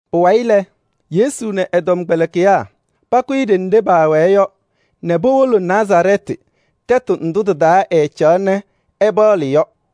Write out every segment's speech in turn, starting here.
Pʋwayɩ lɛ, Yesu nɛ ɛ-tɔmkpɛlɩkɩyaa pakʋyɩ ɖenɖe paawɛɛ yɔ nɛ powolo Nazarɛɛtɩ tɛtʋ ndʋ tɩ-taa ɛcaɣaɣ nɛ ɛpaɣlɩ yɔ.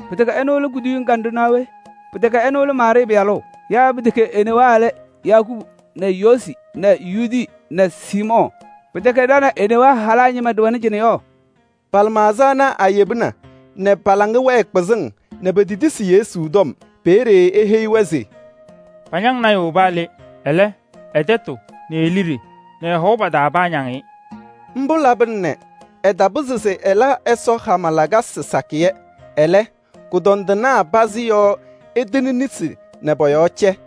Pɩtɛkɛ ɛnʋ lɛ kuduyiŋ kanɖʋ naa we? Pɩtɛkɛ ɛnʋ lɛ Maarɩɩ pɩyalʋ? Yaa pɩtɛkɛ e-newaa lɛ Yakubu nɛ Yoosi nɛ Yuudi nɛ Siimɔɔ? Pɩtɛkɛ ɖa nɛ e-newaa halaa ñɩma ɖɩwɛnɩ cɩnɛ yɔ?” Pa-lɩmaɣza ana ayebina nɛ pa-laŋa wɛɛ kpɩzɩŋ nɛ petetisi Yesu tɔm. Peeye eheyi-wɛ se: “Pañaŋ lɔɔyaɣ tʋ paa le. Ɛlɛ, ɛ-tɛtʋ nɛ e-liɖe nɛ ɛ-hɔʋ pa-taa paañaŋ-ɩ.” Mbʋ labɩna nɛ ɛtapɩzɩ se ɛla Ɛsɔ hama lakasɩ sakɩyɛ. Ɛlɛ, kʋdɔndɩnaa pazɩ yɔɔ ɛtɩnɩ nesi nɛ pɔ-yɔɔ cɛ.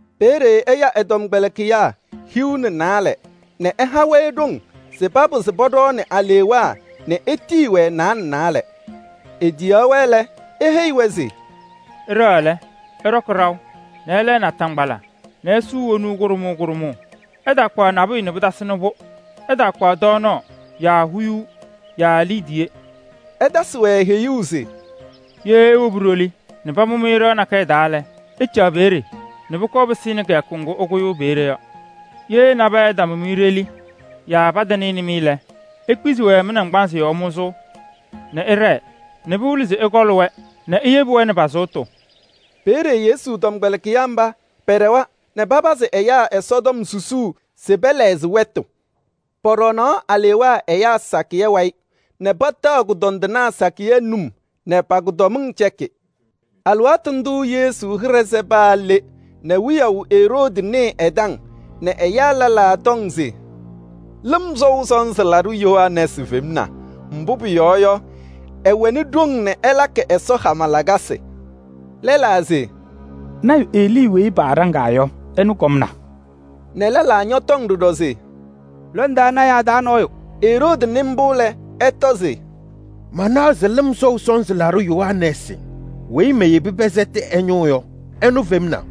Peeye ɛya ɛ-tɔmkpɛlɩkɩyaa hiu nɛ naalɛ nɛ ɛha-wɛ ɖoŋ se papɩzɩ pɔɖɔɔnɩ alewaa nɛ etiyi-wɛ naalɛ naalɛ. Etiyaɣ-wɛ lɛ, eheyi-wɛ se: “Ɩɖɛɣ lɛ, ɩɖɔkɩ ɖaʋ nɛ ɩlɛɛ naataŋgbala nɛ isuu wonuu kʋɖʋmʋʋ kʋɖʋmʋʋ. Ɩtaakpaɣ nabʋyʋ nɛ pɩtasɩnɩ-pʋ. Ɩtaakpaɣ tɔɔnaɣ yaa huyuu yaa liidiye.” Ɛtasɩ-wɛ heyuu se: “Ye iwobi ɖoli nɛ pamʋ-mɩ ɖɩɣa nakɛyɛ taa lɛ, ɩcaɣ peeye nɛ pʋkɔɔ pɩsɩnɩ kɩyakʋ ŋgʋ ɩkʋyʋʋ peeye yɔ. Ye nabɛyɛ ɛtamʋ-mɩ ɖoli yaa patanɩnɩ-mɩ lɛ, ikpizi-wɛ mɩ-naŋgbanzɩ yɔɔ mʋzʋʋ nɛ ɩɖɛɛ nɛ pɩwɩlɩ se ɩkɔɔlɩ-wɛ nɛ iyebi-wɛ nɛ pa-sʋʋtʋ.” Peeye Yesu tɔmkpɛlɩkɩyaa mba pɛɖɛwa nɛ papazɩ ɛyaa Ɛsɔtɔm susuu se pɛlɛɣzɩ wɛtʋ. Pɔɖɔɔnaɣ alewaa ɛyaa sakɩyɛ wayɩ nɛ pataɣ kʋdɔndɩnaa sakɩyɛ num nɛ pa-kʋdɔmɩŋ cɛkɩ. Alɩwaatʋ ndʋʋ Yesu hɩɖɛ sɛ paa le nɛ wiyaʋ Eroodi nɩɩ ɛ-taŋ nɛ ɛyaa lɛlaa tɔŋ se: “Lɩm Sɔʋ Sɔnzɩ Laɖʋ Yohanɛɛsɩ femna. Mbʋ pʋyɔɔ yɔ, ɛwɛnɩ ɖoŋ nɛ ɛlakɩ Ɛsɔ hama lakasɩ.” Lɛlaa se: “Lɔɔyaɣ tʋ Elii weyi paaɖaŋaa yɔ, ɛnʋ kɔmna” nɛ lɛlaa ñɔtɔŋ ɖɔɖɔ se: “Lɔndaa lɔɔyɩsɩ tɩnaa taa nɔɔyʋ.” Eroodi nɩ mbʋ lɛ, ɛtɔ se: “Manaɣ se Lɩm Sɔʋ Sɔnzɩ Laɖʋ Yohanɛɛsɩ weyi meyebi pɛsɛtɩ ɛ-ñʋʋ yɔ, ɛnʋ femna.”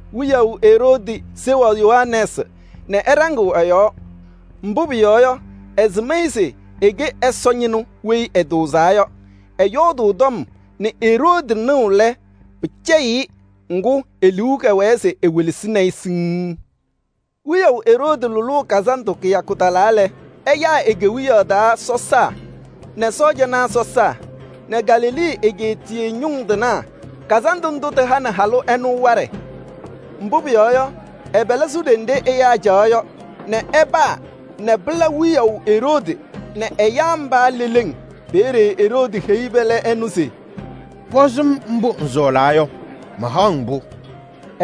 Wiyaʋ Eroodi seɣaɣ Yohanɛɛsɩ nɛ ɛɖaŋɩɣ ɛ-yɔɔ. Mbʋ pʋyɔɔ yɔ, ɛsɩm-ɩ se ɛkɛ Ɛsɔ ñɩnʋ weyi ɛtʋʋzaa yɔ. Ɛyɔɔdʋʋ tɔm nɛ Eroodi nɩɣ lɛ, pɩcɛyɩɣ-ɩ. Ŋgʋ, e-liu kɛwɛɛ se ewelesini-i siŋŋ. Wiyaʋ Eroodi lʋlʋʋ kazandʋ kɩyakʋ talaa lɛ, ɛyaa e-kewiyaɣ taa sɔsaa nɛ sɔɔjanaa sɔsaa nɛ Galilee egeetiye ñʋŋ tɩnaa. Kazandʋ ndʋ tɩhanɩ halʋ ɛnʋ waɖɛ. Mbʋ pʋyɔɔ yɔ, ɛ-pɛlɛ sʋ ɖenɖe ɛyaa caɣaɣ yɔ nɛ ɛpaa nɛ pɩla wiyaʋ Eroodi nɛ ɛyaa mba leleŋ. Peeye Eroodi heyi pɛlɛ ɛnʋ se: “Pɔzɩ-m mbʋ ŋsɔɔlaa yɔ, mahaɣ-ŋ-pʋ.”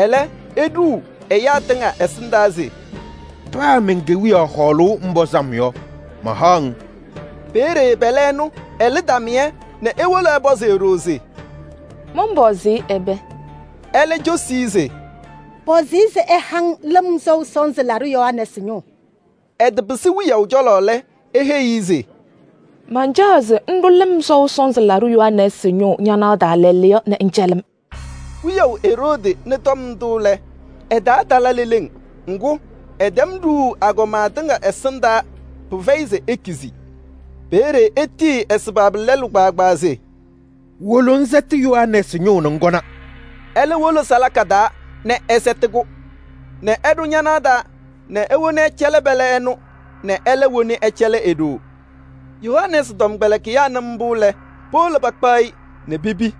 Ɛlɛ, eɖuu ɛyaa tɩŋa ɛsɩndaa se: “Paa men-kewiyaɣ hɔɔlʋʋ ŋpɔzɩ-m yɔ, mahaɣ-ŋ.” Peeye pɛlɛ ɛnʋ ɛlɩ tamɩyɛ nɛ ewolo ɛpɔzɩ e-ɖoo se: “Mɔnpɔzɩ-ɩ ɛbɛ?” Ɛlɛ cosi-i se: “Pɔzɩ-ɩ se ɛha-ŋ Lɩm Sɔʋ Sɔnzɩ Laɖʋ Yohanɛɛsɩ ñʋʋ.” Ɛtɩpɩsɩ wiyaʋ cɔlɔ lɛ, eheyi-i se: “Mancaɣ se ŋɖʋ Lɩm Sɔʋ Sɔnzɩ Laɖʋ Yohanɛɛsɩ ñʋʋ ñanaɣ taa lɛɛlɛɛyɔ nɛ ŋcɛlɩ-m.” Wiyaʋ Eroodi nɩ tɔm ndʋ lɛ, ɛ-taa tala leleŋ. Ŋgʋ, ɛtɛm ɖuuu agɔma tɩŋa ɛsɩndaa. Pɩfɛyɩ se ekizi. Peeye etitiyi ɛ-sabaabi lɛlʋ se: “Wolo ŋsɛtɩ Yohanɛɛsɩ ñʋʋ nɛ ŋkɔna.” Ɛlɛ wolo salaka taa nɛ ɛsɛtɩ-kʋ nɛ ɛɖʋ ñanaɣ taa nɛ ewoni ɛcɛlɩ pɛlɛ ɛnʋ nɛ ɛlɛ woni ɛcɛlɩ e-ɖoo. Yohanɛɛsɩ tɔmkpɛlɩkɩyaa nɩ mbʋ lɛ, powolo pakpaɣ-ɩ nɛ pepi.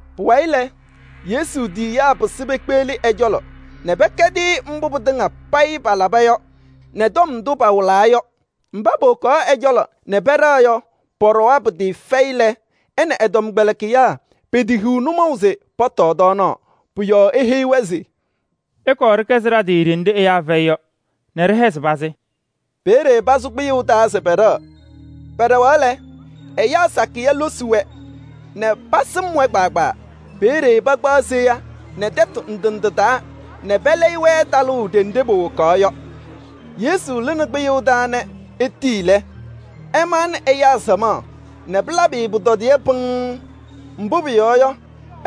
Pʋwayɩ lɛ, Yesu tiyiyaa pɩsɩ pekpeɣli ɛ-cɔlɔ nɛ pɛkɛdɩ-ɩ mbʋ pɩtɩŋa payɩ palaba yɔ nɛ tɔm ndʋ pawɩlaa yɔ. Mba powokaɣ ɛ-cɔlɔ nɛ pɛɖɛɣ yɔ, pɔɖɔwa pɩtɩɩfɛyɩ lɛ, ɛ nɛ ɛ-tɔmkpɛlɩkɩyaa petehiɣ nʋmɔʋ se pɔtɔɔ tɔɔnaɣ. Pʋ-yɔɔ eheyi-wɛ se: “Ɩkɔɔ ɖɩkɛzɩ ɖa-tɩ ɖenɖe ɛyaa fɛyɩ yɔ nɛ ɖɩhɛzɩ pazɩ.” Peeye pasʋ kpɩyʋʋ taa se pɛɖɛɣ. Pɛɖɛɣaɣ lɛ, ɛyaa sakɩyɛ losi-wɛ nɛ pasɩm-wɛ kpaagbaa. Peeye pakpaɣ seya nɛ tɛtʋ ndɩ ndɩ taa nɛ pɛlɛyɩ-wɛ talʋʋ ɖenɖe powokaɣ yɔ. Yesu lɩnɩ kpɩyʋʋ taa nɛ etii lɛ, ɛmaɣnɩ ɛyaa samaɣ nɛ pɩlabɩ-ɩ pʋtɔdɩyɛ pɩŋŋ. Mbʋ pʋyɔɔ yɔ,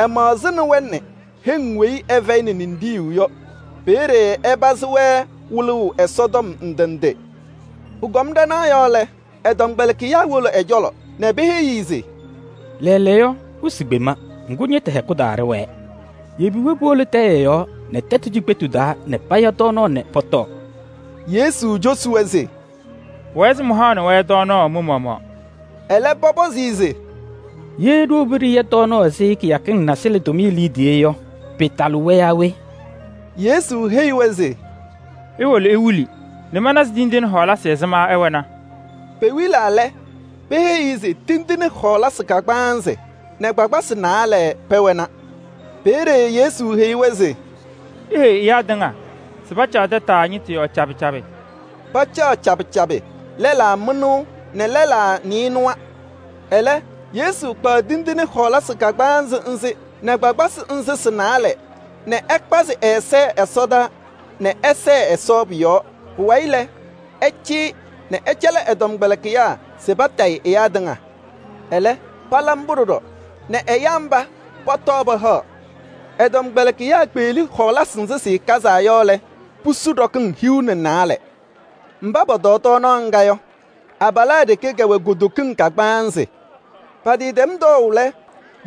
ɛmaɣzɩnɩ-wɛ nɛ heŋ weyi ɩfɛyɩnɩ ninɖiɣyu yɔ. Peeye ɛpazɩ-wɛ wɩlʋʋ Ɛsɔtɔm ndɩ ndɩ. Pʋkɔm ɖanaɣ yɔɔ lɛ, ɛ-tɔmkpɛlɩkɩyaa wolo ɛ-cɔlɔ nɛ peheyi-i se: “Lɛɛlɛɛyɔ wɩsɩ kpema, ŋgʋ ñɩtʋ hɛkʋ taa ɖɩwɛɛ. Yebi-wɛ powolo tɛyɛ yɔɔ nɛ tɛtʋ cikpetu taa nɛ paya tɔɔnaɣ nɛ pɔtɔɔ.” Yesu cosi-wɛ se: “Pʋwɛɛ se mɩhaɣnɩ-wɛ tɔɔnaɣ mɩ-maɣmaɣ.” Ɛlɛ, pɔpɔzɩ-ɩ se: “Ye ɖiwobi ɖɩya tɔɔnaɣ ɛzɩ kɩyakɩŋ nasɩlɛ tʋmɩyɛ liidiye yɔ, pɩɩtalɩ-wɛ yaa we?” Yesu heyi-wɛ se: “Iwolo iwili nɛ mana se tindine ɛzɩma ɩwɛna.” Pewilaa lɛ, peheyi-i se tindine kagbaanzɩ nɛ kpakpasɩ naalɛ pɛwɛna. Peeye Yesu heyi-wɛ se: “Iheyi ɛyaa tɩŋa se pacaɣ tataa ñɩtʋ yɔɔ cabɩ cabɩ.” Pacaɣ cabɩ cabɩ, lɛlaa mɩnʋʋ nɛ lɛlaa nɩɩnʋwa. Ɛlɛ, Yesu kpaɣ tindine ana a-kagbaanzɩ nɛ kpakpasɩ nzɩ sɩ-naalɛ nɛ ɛkpazɩ ɛza ɛsɔdaa nɛ ɛsɛɛ Ɛsɔ pʋ-yɔɔ. Pʋwayɩ lɛ, ɛcɩyɩ nɛ ɛcɛlɩ ɛ-tɔmkpɛlɩkɩyaa se patayɩ ɛyaa tɩŋa. Ɛlɛ, pala mbʋ ɖɔɖɔ nɛ ɛyaa mba pɔtɔɔ pahaɣ. Ɛ-tɔmkpɛlɩkɩyaa kpeɣli hɔɔlasɩ nzɩ sɩkazaa yɔ lɛ, pusu ɖɔkɩŋ hiu nɛ naalɛ. Mba pɔtɔɔ tɔɔnaɣ ŋga yɔ, abalaa ɖeke kɛwɛ kutokiŋ kagbaanzɩ. Patɩtɛm tɔɔʋ lɛ,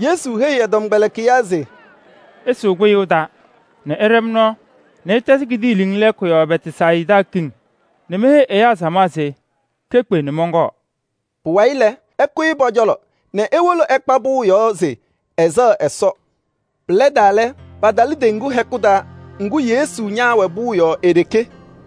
Yesu heyi ɛ-tɔmkpɛlɩkɩyaa se: “Ɩsʋʋ kpɩyʋʋ taa nɛ ɩɖɛ-m nɔɔ nɛ ɩtɛzɩ kidiiliŋ lɛɛkʋ yɔɔ Bɛtsayɩda kiŋ nɛ meheyi ɛyaa samaɣ se kekpe nɛ mɔnkɔɔ.” Pʋwayɩ lɛ, ɛkʋyɩ pɔ-cɔlɔ nɛ ewolo ɛkpa pʋʋ yɔɔ se ɛsɛɣ Ɛsɔ. Pɩlɛdaa lɛ, patalɩ teŋgu hɛkʋ taa. Ŋgʋ, Yesu ñaawɛ pʋʋ yɔɔ e-ɖeke.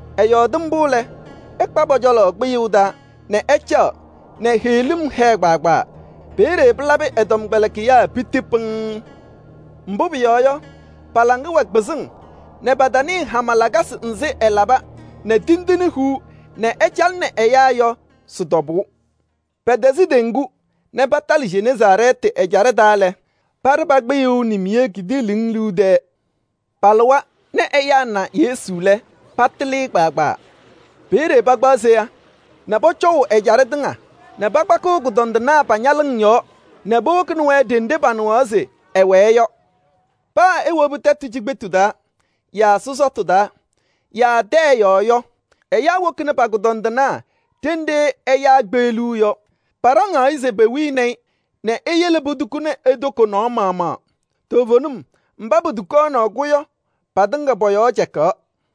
Ɛyɔɔdɩ mbʋ lɛ, ɛkpa pɔ-cɔlɔ kpɩyʋʋ taa nɛ ɛcaɣ nɛ heɣlim tɩhɛʋ. Peeye pɩlabɩ ɛ-tɔmkpɛlɩkɩyaa piti pɩŋŋ. Mbʋ pʋyɔɔ yɔ, pa-laŋa wɛ kpɩzɩŋ nɛ pataanɩɩ hama lakasɩ nzɩ ɛlaba nɛ tindine huu nɛ ɛcalɩnɩ ɛyaa yɔ sɩ-tɔbʋʋ. Pɛtɛzɩ teŋgu nɛ patalɩ Jeneezaarɛɛtɩ ɛjaɖɛ taa lɛ, paɖɩ pa-kpɩyʋʋ nimiye kidiiliŋ liu tɛɛ. Palɩwa nɛ ɛyaa na Yesu lɛ, patɩlɩ-ɩ kpaagbaa. Peeye pakpaɣ seya nɛ pɔcɔʋ ɛjaɖɛ tɩŋa nɛ pakpakɩɣ kʋdɔndɩnaa pa-ñalɩŋ taa nɛ powokini-wɛ ɖenɖe panɩɣaɣ se ɛwɛɛ yɔ. Paa ewobi tɛtʋ cikpetu taa yaa sɔsɔtʋ taa yaa tɛyɛ yɔɔ yɔ, ɛyaa wokini pa-kʋdɔndɩnaa ɖenɖe ɛyaa kpeɣliɣ yɔ. Paɖaŋaɣ-ɩ se pewini-i nɛ eyele potukuni e-toko nɔɔ maɣmaɣ. Toovenim mba potukaɣnɩ-kʋ yɔ, patɩŋa pɔ-yɔɔ cɛkaɣ.